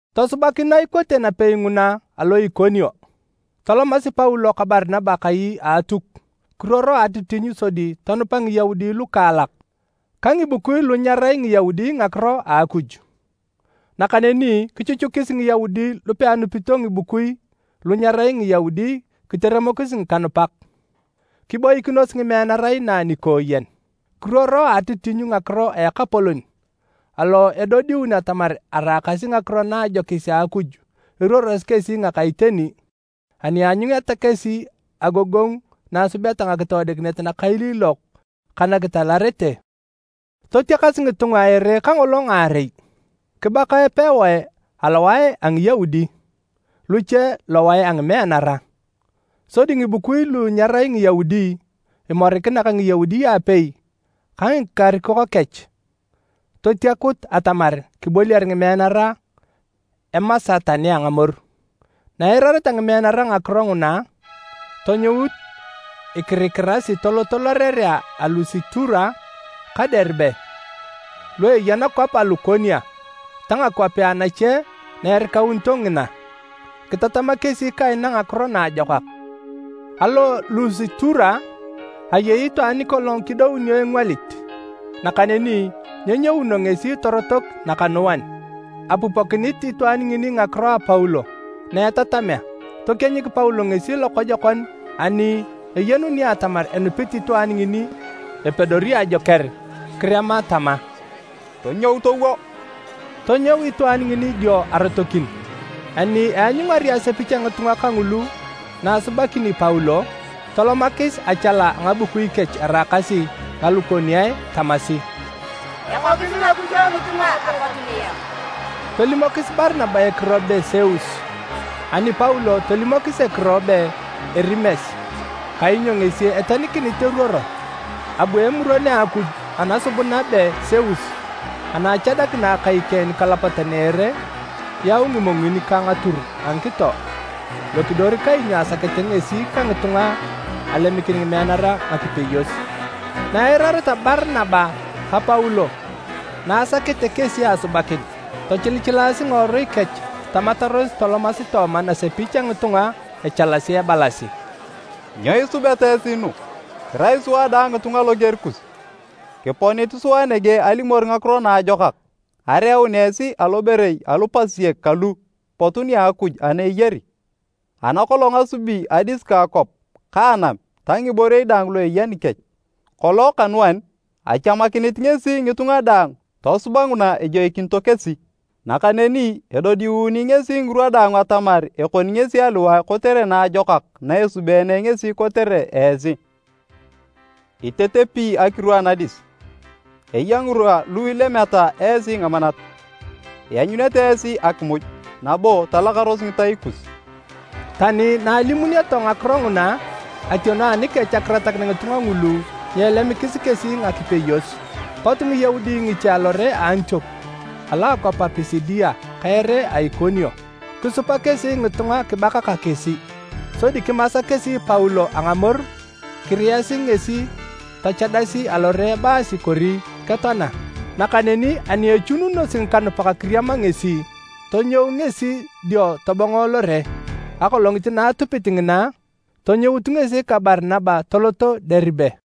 Tosubakin na ikote napei nguna alo Ikonio, tolomasi Paulo ka Barinaba kai a Atuk kiruoro a atitinyu sodi tonupa Ngiyaudi lukaalak ka ngibukui lu nyerai Ngiyaudi ngakiro a Akuj. Nakaneni kichuchukis Ngiyaudi lu peanupito ngibukui lu nyerai Ngiyaudi kiteremokis ngikanupak. Kiboikinos ngimeanara inaa nikooyen. Kiruoro a atitinyu ngakiro a Ekapolon alo edodiuni atamar araakasi ngakiro na a ajokis a Akuj eruorosi kesi ngaka iteni ani aanyuneta kesi agogongu na esubeta ngakitoodikinet nakailiilok ka nakitalarete. Totiakas ngitunga a ere kangolo ngaarei, kibaka epewae alowae a Ngiyaudi, luche lowae a ngimeanara. Sodi ngibukui lu nyerai Ngiyaudi, imorikina ka Ngiyaudi aapei ka ngikarikok kech, totiakut atamar kiboliar ngimeanara emasa tani a ngamoru. Na eirareta ngimeanara ngakiro nguna, tonyout ikirikirasi toloto lorerea a Lusitura ka Deribe, lu eya nakwap a Lukonia ta ngakwapea nache na erikaunito ngina. Kitatama kesi kaina Ngakiro Naajokak. Alo Lusitura, ayei itwaan nikolong kidounio engwalit, nakaneni nyenyouno ngesi torotok nakanuan. Apupokinit itwaan ngini ngakiro a Paulo na etatamea. Tokienyik Paulo ngesi lokojokon ani eyenuni atamar enupit itwaan ngini epedori ajoker, kirema tama, “Tonyou towo!” Tonyou itwaan ngini dio arotokin. Ani eanyungari asepich a ngitunga kangulu na asubakini Paulo, tolomakis achala a ngabukui kech eraakasi Ngalukoniae tamasi, “Ekokis ngakujo ngitunga apot niyok!” Tolimokis Barinaba ekiro be Seus, ani Paulo, tolimokis ekiro be Erimes kainyo ngesi etenikinit eruoro. Abu emuron a akuj anasubuna be Seus ana achadakina akai keng nikalapatan a ere, yau ngimongin ka ngatur a ngikito lokidor kainyo asakete ngesi ka ngitunga alemikin ngimeanara ngakipeyos. Na eirareta Barinaba ka Paulo na asakete kesi asubakin, tochilichilaasi ngiworui kech tamataros tolomasi tooma nasepich a ngitunga echalasi ebalasi, “Nyo isubeta esi nu? Kirai sua dang ngitunga loger kus! Kiponit sua nege alimor Ngakiro Naajokak, areeun esi aloborei alu pasiek kalu pot nia Akuj ana eyari, ana kolong asubi adis ka akwap ka anam ta ngiborei daang lu eya nikech. Kolong kanuan, achamakinit ngesi ngitunga daang tosuba nguna ejoikinito kesi. Nakaneni edodiuunu ngesi ngirwa daang atamar ekoni ngesi aliwae kotere naajokak na esubeene ngesi kotere esi. Itetepi akiru anadis, eya ngirwa lu ilemeta esi ngamanat, ianyunete esi akimuj nabo talakaros ngitai kus.” Tani na alimunioto ngakiro nguna, ationo anikech akiratakin ngitunga ngulu nyeelemikis kesi ngakipeyos. Pot Ngiyaudi ngiche alore a Antiok alo a akwap a Pisidia ka ere a Ikonio. Kisupa kesi ngitunga kibaka ka kesi. Sodi kimasa kesi Paulo a ngamoru kiriyasi ngesi tochadasi alore ebaasi kori ketoana. Nakaneni ani echununosi ngikanupak kiriama ngesi, tonyou ngesi dio tobongo lore. Akolongit na atupit ngina, tonyout ngesi ka Barinaba toloto Deribe.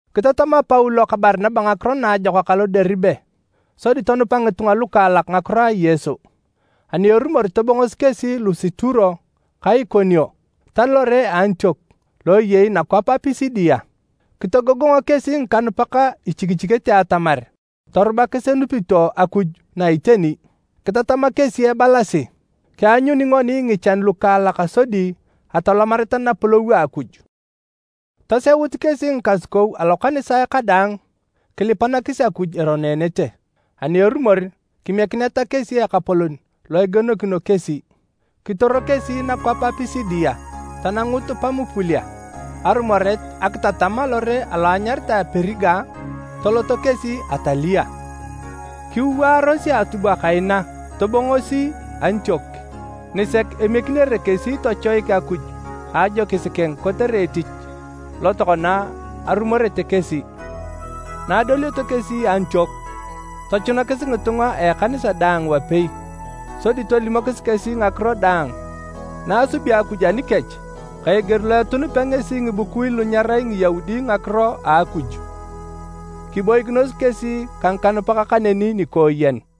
Kitatama Paulo ka Barinaba Ngakiro Naajokak alo Deribe sodi tonupa ngitunga lukaalak ngakiro a Yesu. Ani erumor tobongosi kesi Lusitura ka Ikonio ta lore a Antiok lo eyei nakwap a Pisidia. Kitogogongo kesi ngikanupak ichikichikete atamar torubakis enupito Akuj na iteni. Kitatama kesi ebalasi, “Kianyuni ngoni ngichan lukaalak sodi atolomareta Napolou a Akuj.” Toseut kesi ngikasukou alokanisae kadaang kilipanakis Akuj eroneenete, ani erumor kimiekineta kesi Ekapolon lo egienokino kesi. Kitoro kesi nakwap a Pisidia, tanangut Pamupulia. Arumoret akitatam alore alo enyaritae Periga, toloto kesi Atalia. Kiwaaros a atubwa kaina tobongosi Antiok, nisek emiekinere kesi tochoik Akuj a ajokis keng kotere etich lo tokona arumorete kesi. Na adolioto kesi Antiok, tochunakis ngitunga a ekanisa daang wapei sodi tolimokis kesi ngakiro daang na asubi Akuj anikech ka eger lo etunupea ngesi ngibukui lu nyerai Ngiyaudi ngakiro a Akuj. Kiboikinos kesi ka ngikanupak kaneni nikooyen.